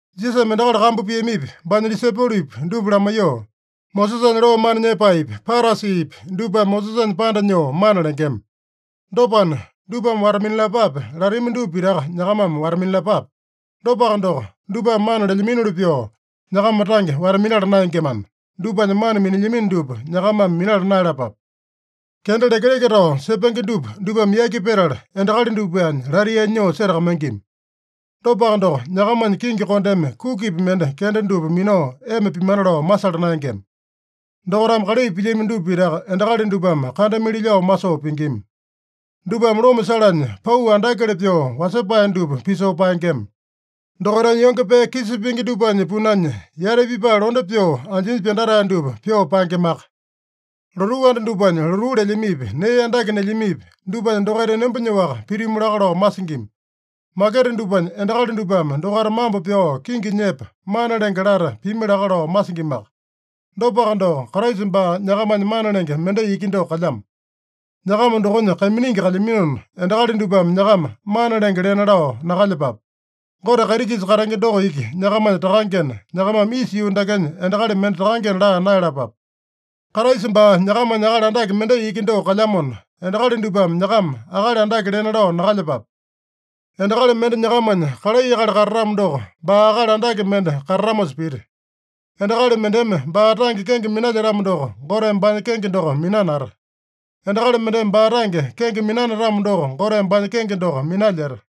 Jisasame endakali kambu piamipi, baanya disaipolopi dupa lamaiyoo, “Mosesanya loo mana nyepaepi, Parasipi dupame Mosesanya panda nyoo mana lengema. Dopana, dupame wata-minalapape latami dupa pitaka nyakamame wata-minalapape. Dopaka doko, dupame mana lelyaminoli pyoo, nyakama tange wata-minala naengemana, dupanya mana minilyamino dupa nyakamame minala naeyalapape. Kenda lekeleke tao sepenge dupa dupame yaki petala, endakali dupanya lataiyanya nyoo setakamaingima. Dopaka doko, nyakamanya kingi kondeme kukipi mende kenda dupa minao ema pimana lao masala naengema. Dokaitame kalai pilyami dupa pitaka endakali dupame kandamili lao masoo pingima. Dupame loma salanya pau andakele pyoo wasepae dupa pisoo paengema. Dokaitanya yonge pee kisa pingi dupanya punanya yati pipae londe pyoo anjinya pyandatae dupa pyoo paengemaka. Lotuu anda dupanya lotuu lelyamipi, nee andake nelyamipi, dupanya dokaita enomba nyoaka pitimu laka lao masingima. Maketa dupanya endakali dupame dokaita mambo pyao kingi nyepa, ‘Mana Lenge’ lata pimi laka lao masingimaka. Dopaka doko, Kraisa baa nyakamanya mana lenge mendai iki doko kalyamo. Nyakama dokonya kaiminingi kalyaminona, endakali dupame nyakama ‘Mana Lenge’ lena lao nakalyepape. Gote kaiti-kisa katenge doko iki nyakamanya Takangena, nyakamame isa yuu dakenya endakali mende ‘Takangena’ laa naeyalapape. Kraisa baa nyakamanya akali andake mendai iki doko kalyamona, endakali dupame nyakama ‘Akali Andake’ lena lao nakalyepape. Endakali mende nyakamanya kalai akali katatamo doko, baa akali andake mende katatamosa pita. Endakali mendeme baa tange kenge minalyetamo doko, Goteme baanya kenge doko minanata. Endakali mendeme baa tange kenge minanatamo doko, Goteme baanya kenge doko minalyeta.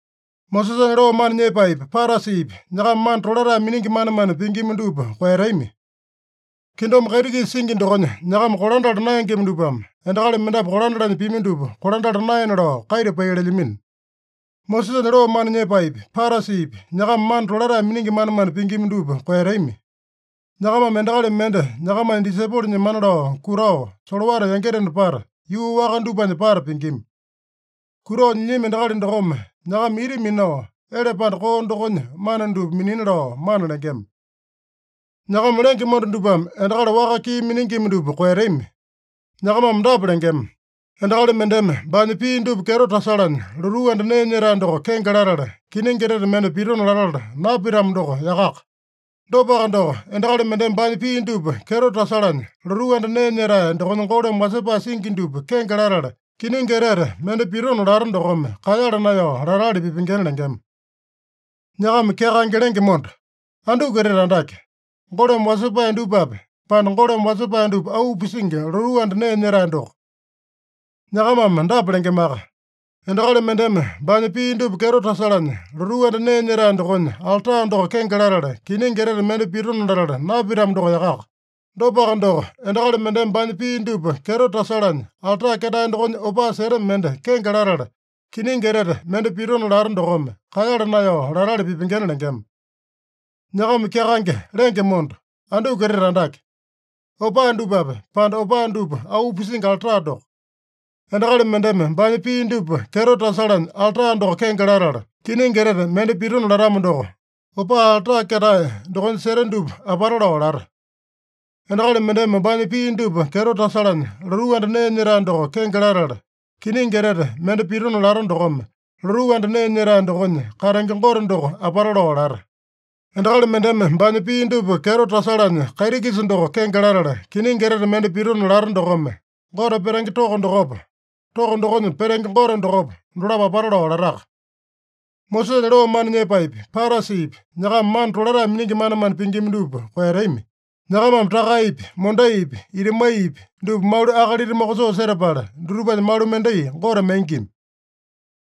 “Mosesanya loo mana nyepaepi, Parasipi, nyakama mana tolatae miningi manemane pingima dupa koeyatami. Kingdom kaiti-kisa singi dokonya nyakama kolandala naengema dupame endakali mendapu kolandalanya pimi dupa kolandala naena lao kaita pai lelyamino. “Mosesanya loo mana nyepaepi, Parasipi, nyakama mana tolatae miningi manemane pingima dupa koeyatami. Nyakamame endakali mende nyakamanya disaipolo nyemana lao kutao, solowata yangitena pata, yuu waka dupanya pata pingima. Kutao nyilyami endakali dokome nyakama ita minao, ele panda koo dokonya mana dupa minina lao mana lengema. “Nyakama lenge monda dupame endakali waka kii miningima dupa koeyatami. Nyakamame dapa lengema: ‘Endakali mendeme baanya pii dupa kyeto tasalanya lotuu anda nee nyetae doko kenge latala, kiningi etete mende pitona latala napitamo doko yakaka. Dopaka doko, endakali mendeme baanya pii dupa kyeto tasalanya lotuu anda nee nyetae dokonya golome wasepae singi dupa kenge latala, kiningi etete mende pitona lata dokome kaeyala naeyao latali pipengena’ lengema. Nyakama kyakaenge lenge monda! Anduku etete andake? Golome wasepae dupape, pande golome wasepae dupa auu pisingi lotuu anda nee nyetae doko? Nyakamame dapa lengemaka: ‘Endakali mendeme baanya pii dupa kyeto tasalanya lotuu anda nee nyetae dokonya alta doko kenge latala, kiningi etete mende pitona latala napitamo doko yakaka. Dopaka doko, endakali mendeme baanya pii dupa kyeto tasalanya alta ketae dokonya opaa seta mende kenge latala, kiningi etete mende pitona lata dokome, kaeyala naeyao latali pipengena’ lengema. Nyakama kyakaenge lenge monda! Anduku etete andake? Opaa dupape, pande opaa dupa auu pisingi alta doko? Endakali mendeme baanya pii dupa kyeto tasalanya alta doko kenge latala, kiningi etete mende pitona latamo doko, opaa alta ketae dokonya seta dupa apata lao lata. Endakali mendeme baanya pii dupa kyeto tasalanya lotuu anda nee nyetae doko kenge latala, kiningi etete mende pitona lata dokome, lotuu anda nee nyetae dokonya katenge Gote doko apata lao lata. Endakali mendeme baanya pii dupa kyeto tasalanya kaiti-kisa doko kenge latala, kiningi etete mende pitona lata dokome, Gote petenge toko dokopa, toko dokonya petenge Gote dokopa, dolapo apata lao lataka. “Mosesanya loo mana nyepaepi, Parasipi, nyakama mana tolatae miningi manemane pingima dupa koeyatami. Nyakamame takaepi, mondaipi, itamaiyapi dupa malu akalita mokosoo setapala, dutupanya malu mendai Gote maingima.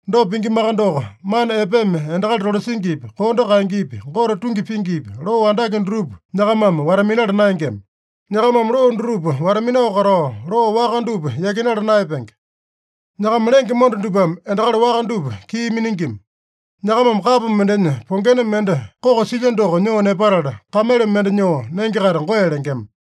Dopa pingimaka doko, mana epeme endakali tolasingipi, kondo kaengepi, Gote tungi pingipi, loo andake dutupa nyakamame wata-minala naengema. Nyakamame loo dutupa wata-minao katao, loo waka dupa yakinala naeyapenge. Nyakama lenge monda dupame endakali waka dupa kii miningima. Nyakamame kapo mendenya pongena mende koko silya doko nyoo nepatala, kamele mende nyoo nenge-kaita goe lengema.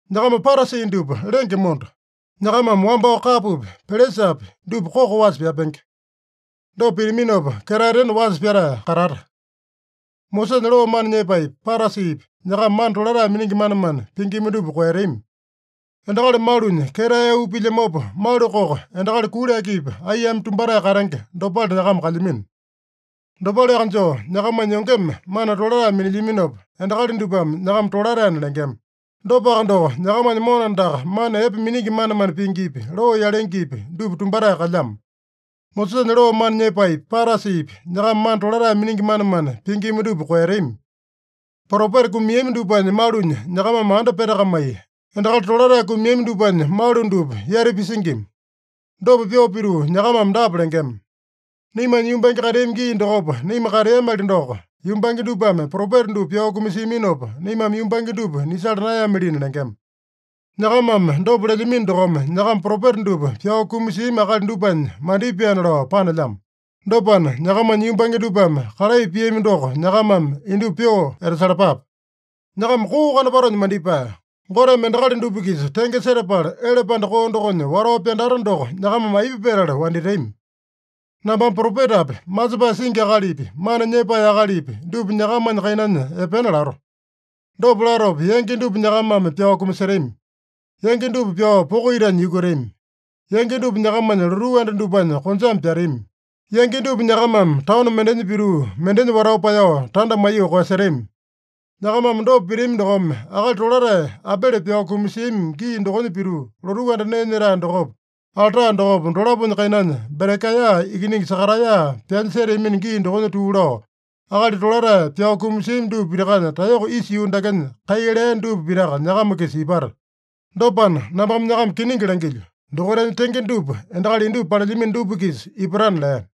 Nyakama Parasi dupa lenge monda! Nyakamame wambao kapopi, pelesapi, dupa koko wasa pyapenge. Dopa pitaminopa, ketaetena wasa pyatae katata. “Mosesanya loo mana nyepaepi, Parasipi, nyakama mana tolatae miningi manemane pingima dupa koeyatami. Endakali malunya ketae auu pilyamopa, malu koko endakali kuli akipi aiyame tumbatae katenge dopale nyakama kalyamino. Dopaleaka joo, nyakamanya yongeme mana tolatae minilyaminopa, endakali dupame nyakama tolataena lengema. Dopaka doko, nyakamanya mona andaka mana epe miningi manemane pingipi, loo yalengepi, dupa tumbatae kalyamo. “Mosesanya loo mana nyepaepi, Parasipi, nyakama mana tolatae miningi manemane pingima dupa koeyatami. Propeta kumiami dupanya malunya nyakamame anda petakamai, endakali tolatae kumiami dupanya malu dupa yati pisingima. Dopa pyoo pituu nyakamame dapa lengema: ‘Naimanya yumbange kateami gii dokopa naima kateamali doko, yumbange dupame propeta dupa pyao kumasiaminopa, naimame yumbange dupa nisala naeyamalina’ lengema. Nyakamame dopa lelyamino dokome, nyakama propeta dupa pyao kumasiami akali dupanya mandipaena lao panelyamo. Dopana, nyakamanya yumbange dupame kalai piami doko nyakamame indupa pyoo etasalapape. Nyakama koo kanopatonya mandipae! Goteme endakali dupa-kisa tenge setapala, ele panda koo dokonya watao pyandata doko nyakamame aipa petala wanditami? Nambame propetapi, masepae singi akalipi, mana nyepae akalipi dupa nyakamanya kainanya epena lato. Dopa latopa, yangi dupa nyakamame pyao kumasetami. Yangi dupa pyao poko itanya yukutami. Yangi dupa nyakamanya lotuu anda dupanya konjame pyatami. Yangi dupa nyakamame taono mendenya pituu, mendenya watao paeyao, tanda maiyoo koeyasetami. Nyakamame dopa pitami dokome, akali tolatae Abele pyao kumasiami gii dokonya pituu, lotuu anda nee nyetae dokopa, alta dokopa, dolaponya kainanya Berekaeya ikiningi Sakaraeya pyanya seteami gii dokonya tuu lao, akali tolatae pyao kumasiami dupa pitakanya taeyoko isa yuu dakenya kai lea dupa pitaka nyakama-kisa ipata. Dopana, nambame nyakama kiningi langilyo: Dokaitanya tenge dupa endakali indupa palelyamino dupa-kisa ipatana” lea.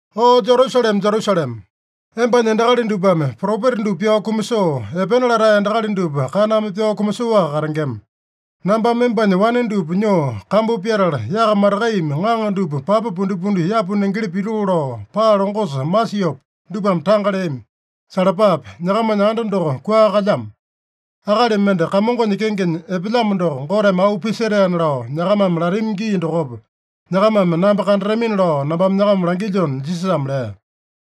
“O Jerusalema, Jerusalema! Embanya endakali dupame propeta dupa pyao kumasoo, epena latae endakali dupa kaname pyao kumasoaka katengema. Nambame embanya wane dupa nyoo kambu pyatala, yaka matakaiyame ŋaŋa dupa papa pundipundi yapu nengeli pitoo lao, paa longosa masiopa, dupame tanga leami. Salapape! Nyakamanya anda doko kua kalyamo. ‘Akali mende Kamongonya kengenya epelyamo doko Goteme auu pisetaena’ lao nyakamame latami gii dokopa, nyakamame namba kandatamina lao nambame nyakama langilyona” Jisasame lea.